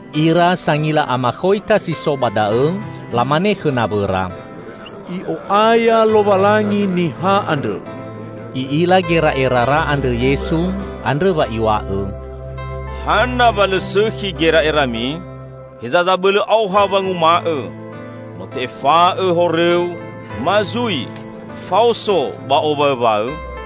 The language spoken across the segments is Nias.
Ira sangila amakhoita si so ba da'õ lamane khõ nawõra, "I'o'aya Lowalangi Niha andrõ!" I'ila gera'erara andrõ Yesu, andrõ wa Iw̃a'õ, "Hana wa lõ sõkhi gera'erami? Heza zabõlõ aoha wanguma'õ, 'No te'efa'õ horõu', ma zui 'Faoso ba owaõwaõ?'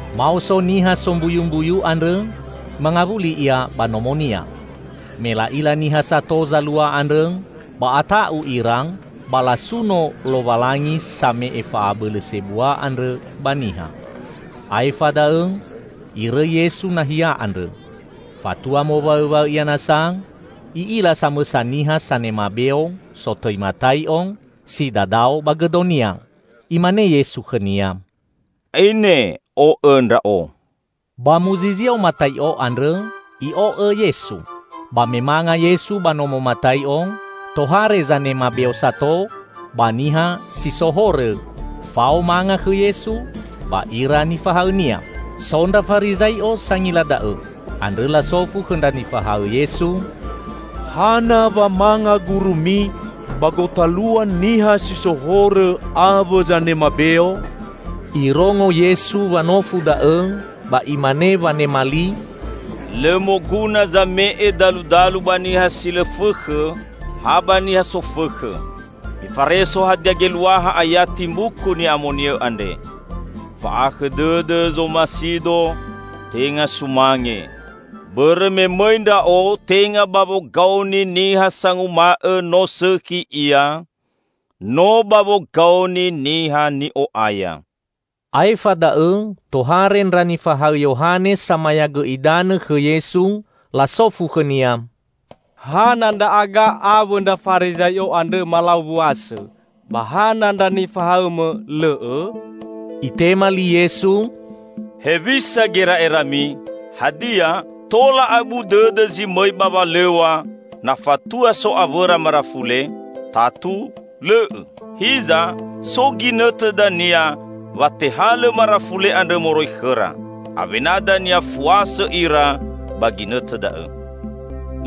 Maoso niha sombuyumbuyu andrõ mangawuli ia ba nomonia. Me la'ila niha sato zalua andrõ, ba ata'u ira ba lasuno Lowalangi same'e fa'abõlõ sebua andrõ ba niha. Aefa da'õ Irõi Yesu nahia andrõ. Fatua mowaõwaõ Ia nasa, I'ila samõsa niha sanema beo, sotõi Matai'o, si dadao ba gõdonia. Imane Yesu khõnia, "Aine o'õ Ndra'o!" Ba muzizio Matai'o andrõ i'o'õ Yesu. Ba me manga Yesu ba nomo Matai'o, tohare zanema beo sato ba niha si so horõ fao manga khõ Yesu ba ira nifahaõ-Nia. So ndra Farizai'o sangila da'õ. Andrõ lasofu khõ ndra nifahaõ Yesu, "Hana wa manga gurumi ba gotalua niha si so horõ awõ zanema beo?" Irongo Yesu wanofu da'õ, ba Imane wanema li, "Lõ moguna zame'e daludalu ba niha si lõ fõkhõ, ha ba niha sofõkhõ. Mifareso hadia geluaha ayati Mbuku Ni'amoni'õ andre: 'Fa'ahakhõ dõdõ zomasi-Do, tenga sumange.' Bõrõ me mõi Ndra'o tenga ba wogaoni niha sanguma'õ no sõkhi ia, no ba wogaoni niha ni'o'aya." Aefa da'õ tohare ndra nifahaõ Yohane Samayagõ Idanõ khõ Yesu. Lasofu khõ-Nia, "Hana ndra'aga awõ ndra Farizai'o andrõ malau wuasõ, ba hana ndra nifahaõ-Mõ lõ'õ?" Itema li Yesu, "Hewisa gera'erami? Hadia tola abu dõdõ zi mõi ba walõw̃a na fatua so awõra marafule? Tatu lõ'õ! Hiza so ginõtõ dania wa tehalõ marafule andrõ moroi khõra. Awena dania fuasõ ira ba ginõtõ da'õ.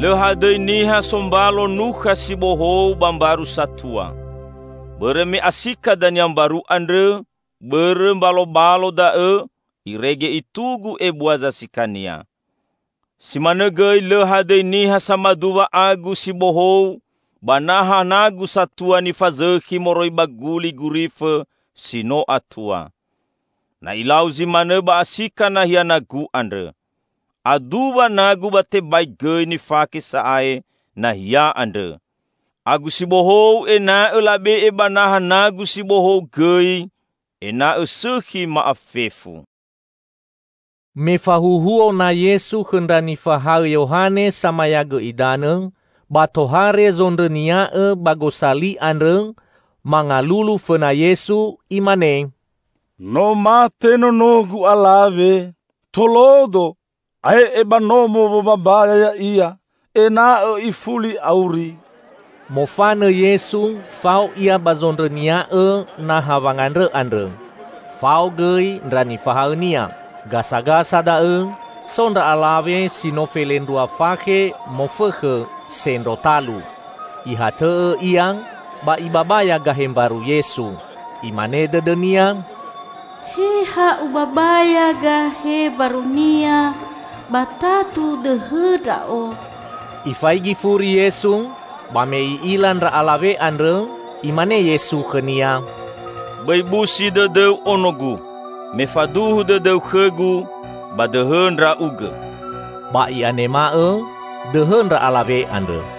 Lõ hadõi niha sombalo nukha si bohou ba mbaru satua. Bõrõ me asika dania mbaru andrõ bõrõ mbalobalo da'õ irege itugu ebua zasikania. Si manõ gõi lõ hadõi niha samaduwa agu si bohou ba naha nagu satua nifazõkhi moroi ba guli gurifõ si no atua. Na ilau zi manõ ba asika nahia nagu andrõ. Aduwa nagu ba tebai gõi nifake sa'ae nahia andrõ. Agu si bohou ena'õ labe'e ba naha nagu si bohou gõi, ena'õ sõkhi ma'afefu." Me fahuhuo na Yesu khõ ndra nifahaõ Yohane Samayagõ Idanõ, ba tohare zondrõnia'õ ba gosali andrõ mangalulu fõna Yesu, imane, "No mate nonogu alawe. Tolodo, ae'e ba nomo wombambaya ya'ia ena'õ ifuli auri." Mofanõ Yesu fao Ia ba zondrõnia'õ naha wangandrõ andrõ. Fao gõi ndra nifahaõ-Nia. Gasagasa da'õ so ndra alawe si no felendrua fakhe mofõkhõ sendro talu. Ihatõ'õ ia ba ibabaya gahe mbaru Yesu. Imane dõdõnia, "He ha ubabaya gahe mbaru-Nia, ba tatu dõhõ ndra'o." Ifaigi furi Yesu. Ba me I'ila ndra alawe andrõ, Imane Yesu khõnia, "Bõi busi dõdõu ono-Gu! Me faduhu dõdõu khõ-Gu, ba dõhõ ndra'ugõ!" Ba i'anema'õ dõhõ ndra alawe andrõ.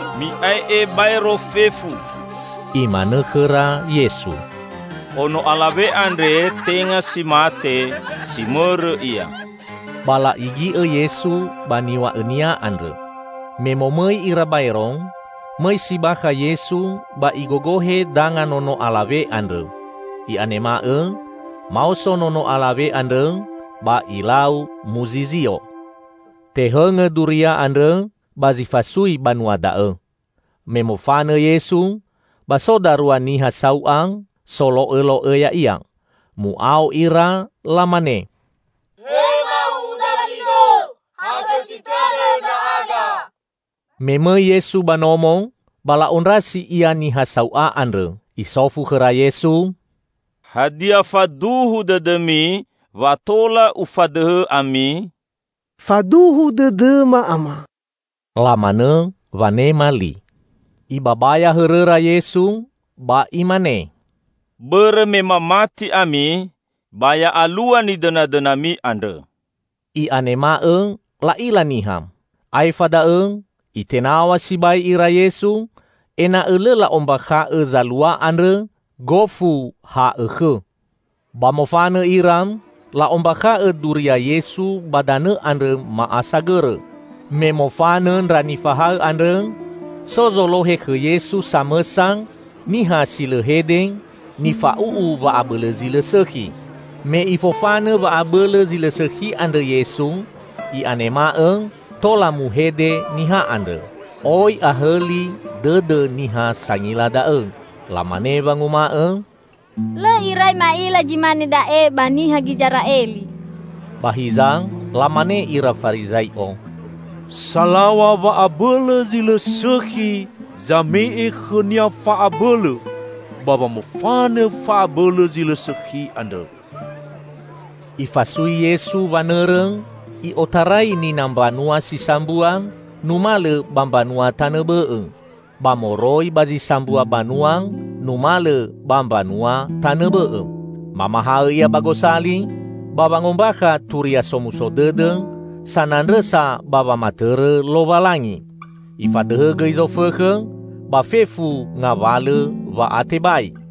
"Mi'ae'e baero fefu!" Imanõ khõra Yesu, "Ono alawe andre tenga si mate; si mõrõ ia." Ba la'igi'õ Yesu ba niw̃a'õ-Nia andrõ. Me momõi ira baero, mõi si bakha Yesu ba Igogohe danga nono alawe andrõ. I'anema'õ maoso nono alawe andrõ ba ilau muzizio. Tehõngõ duria andrõ ba zi fasui banua da'õ. Me mofanõ Yesu, ba so darua niha sau'a solo'õlo'õ Ya'ia. Mu'ao ira lamane, "He ma'uwu Dawido, hakhõsi tõdõ ndra'aga!" Me mõi Yesu ba nomo, ba la'ondrasi Ia niha sau'a andrõ. Isofu khõra Yesu, "Hadia faduhu dõdõmi wa tola Ufadõhõ ami?" "Faduhu dõdõma, Ama!" lamanõ wanema li. Ibabaya hõrõra Yesu ba Imane, "Bõrõ me mamati ami, ba ya alua nidõnadõnami andrõ." I'anema'õ la'ila niha. Aefa da'õ Itenaw̃a sibai ira Yesu ena'õ lõ la'ombakha'õ zalua andrõ gofu ha'õkhõ. Ba mofanõ ira, la'ombakha'õ duria Yesu ba danõ andrõ ma'asagõrõ. Me mofanõ ndra nifahaõ andrõ, so zolohe khõ Yesu samõsa niha si lõ hede, nifa'u'u wa'abõlõ zi lõ sõkhi. Me Ifofanõ wa'abõlõ zi lõ sõkhi andrõ Yesu, i'anema'õ tola muhede niha andrõ. Oi ahõli dõdõ niha sangila da'õ. Lamane wanguma'õ, "Lõ irai ma'ila zi mane da'e ba niha Gizera'eli!" Ba hiza, lamane ira Farizai'o, "Salaw̃a wa'abõlõ zi lõ sõkhi zame'e khõnia fa'abõlõ ba wamofanõ fa'abõlõ zi lõ sõkhi andrõ." Ifasui Yesu wanõrõ i'otarai nina mbanua si sambua numalõ ba mbanua tanõ bõ'õ, ba moroi ba zi sambua banua numalõ ba mbanua tanõ bõ'õ. Mamahaõ Ia ba gosali, ba wangombakha Turia Somuso Dõdõ sanandrõsa ba wamatõrõ Lowalangi. Ifadõhõ gõi zofõkhõ ba fefu ngawalõ wa'atebai.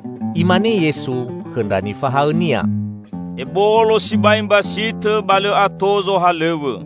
Imane Yesu khõ ndra nifahaõ-Nia, "Ebolo sibai mbasitõ, ba lõ ato zohalõw̃õ.